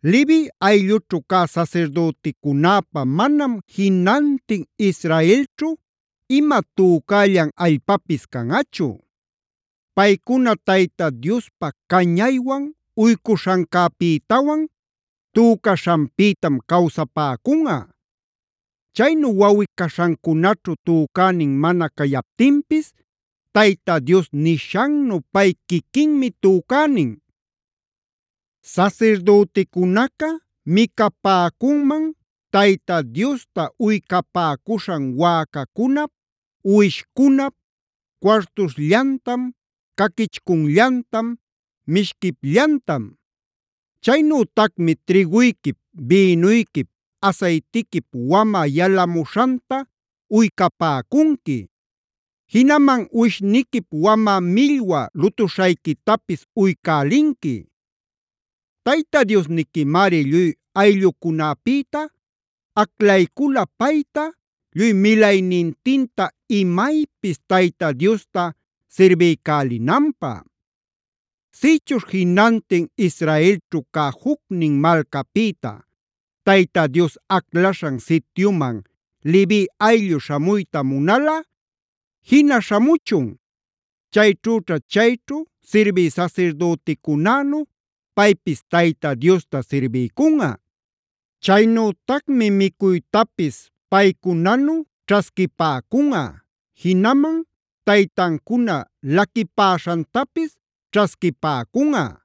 “Levi ayllućhu cä sasirdüticunäpä manam jinantin Israelćhu ima tücällan allpapis canꞌachu. Paycuna Tayta Diospä cañaywan uycuśhancäpïtawan tücaśhanpïtam cawsapäcunꞌa. Chaynu wawꞌi-caśhancunaćhu tücänin mana cayaptinpis Tayta Dios nishannu pay quiquinmi tücänin.a “Sasirdüticunaca micapäcunman Tayta Diosta uycapäcuśhan wäcacunap, uwishcunap cuartuśhllantam, caquichcullantam, mishquipllantam. Chaynütacmi trïguyquip, bïnuyquip, asaytiquip wamä yalamuśhanta uycapäcunqui; jinaman uwishniquip wamä millwa lutuśhayquitapis uycälinqui. Tayta Diosniquimari lluy ayllucunapïta aclaycula payta, lluy milaynintinta imaypis Tayta Diosta sirbiycälinanpä. “Sïchuśh jinantin Israelćhu cä jucnin malcapïta Tayta Dios aclaśhan sityuman Levi ayllu śhamuyta munalꞌa, jina śhamuchun. Chayćhüćha chayćhu sirbï sasirdüticunänu paypis Tayta Diosta sirbiycunꞌa. Chaynütacmi micuytapis paycunanu ćhasquipäcunꞌa, jinaman taytancuna laquipäśhantapis ćhasquipäcunꞌa.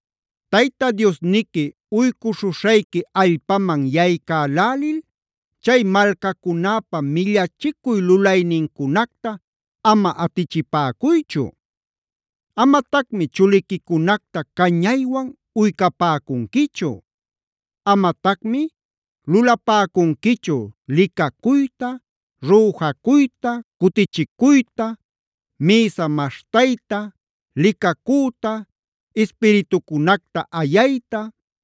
“Tayta Diosniqui uycuśhuśhayqui allpaman yaycälälil chay malcacunäpa millachicuy lulaynincunacta ama atichipäcuychu. Amatacmi chuliquicunacta cañaywan uycapäcunquichu. Amatacmi lulapäcunquichu: licacuyta,b rüjacuyta,c cutichicuyta, mïsa maśhtayta, licacüta, ispiritucunacta ayayta,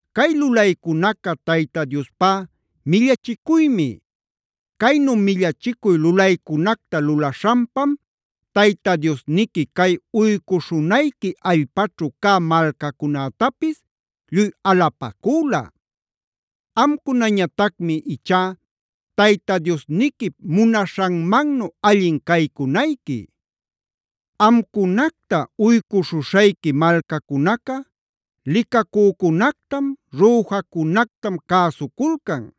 Cay lulaycunaca Tayta Diospá millachicuymi. Caynu millachicuy lulaycunacta lulaśhanpam Tayta Diosniqui cay uycuśhunayqui allpaćhu cä malcacunätapis lluy alapacüla. Amcunañatacmi ichá Tayta Diosniquip munaśhanmannu allin caycunayqui.e Amcunacta uycuśhuśhayqui malcacunaca licacücunactam, rüjacunactam cäsuculcan.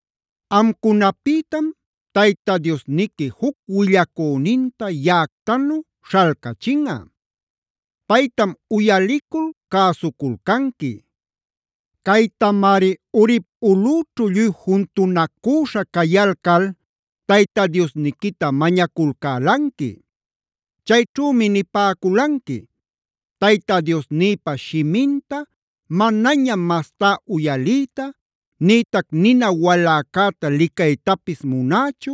“Amcunapïtam Tayta Diosniqui juc willacüninta yaꞌactanu śhalcachinꞌa. Paytam uyalicul cäsuculcanqui. Caytamari Horeb ulꞌüćhu lluy juntunacüśha cayalcal Tayta Diosniquita mañaculcälanqui. Chayćhümi nipäculanqui: ‘Tayta Diosnïpa shiminta manañam mastá uyaliyta, nïtac nina waläcäta licaytapis munächu,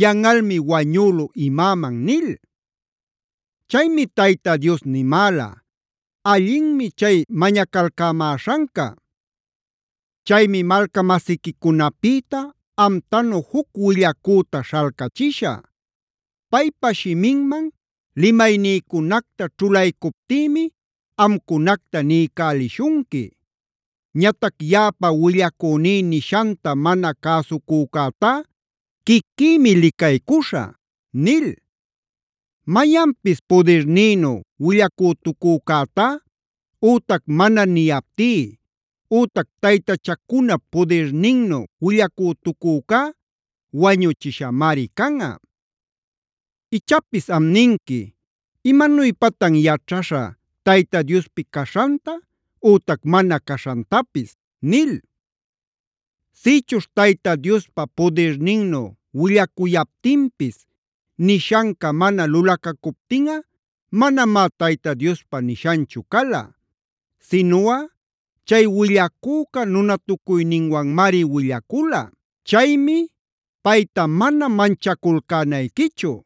yanꞌalmi wañülu imäman’ nil. Chaymi Tayta Dios nimäla: ‘Allinmi chay mañacalcämäśhanca. Chaymi malca-masiquicunapïta amtanu juc willacüta śhalcachishä. Paypa shiminman limaynïcunacta ćhulaycuptïmi amcunacta niycälishunqui. Ñatac yaꞌapa willacüní nishanta mana cäsucücätá quiquïmi licaycuśhä’ nil. Mayanpis pudirnïnu willacütucücätá, ütac mana niyaptí, ütac taytachacunap pudirninnu willacütucücá wañuchishamari canꞌa. Ichapis am ninqui: ‘¿Imanuypatan yaćhaśhä Tayta Diospi caśhanta ütac mana caśhantapis?’ nil. Sïchuśh Tayta Diospa pudirninnu willacuyaptinpis nishanca mana lulacacuptinꞌa manamá Tayta Diospa nishanchu cala. Sinuꞌa chay willacüca nunatucuyninwanmari willacula. Chaymi payta mana manchaculcänayquichu.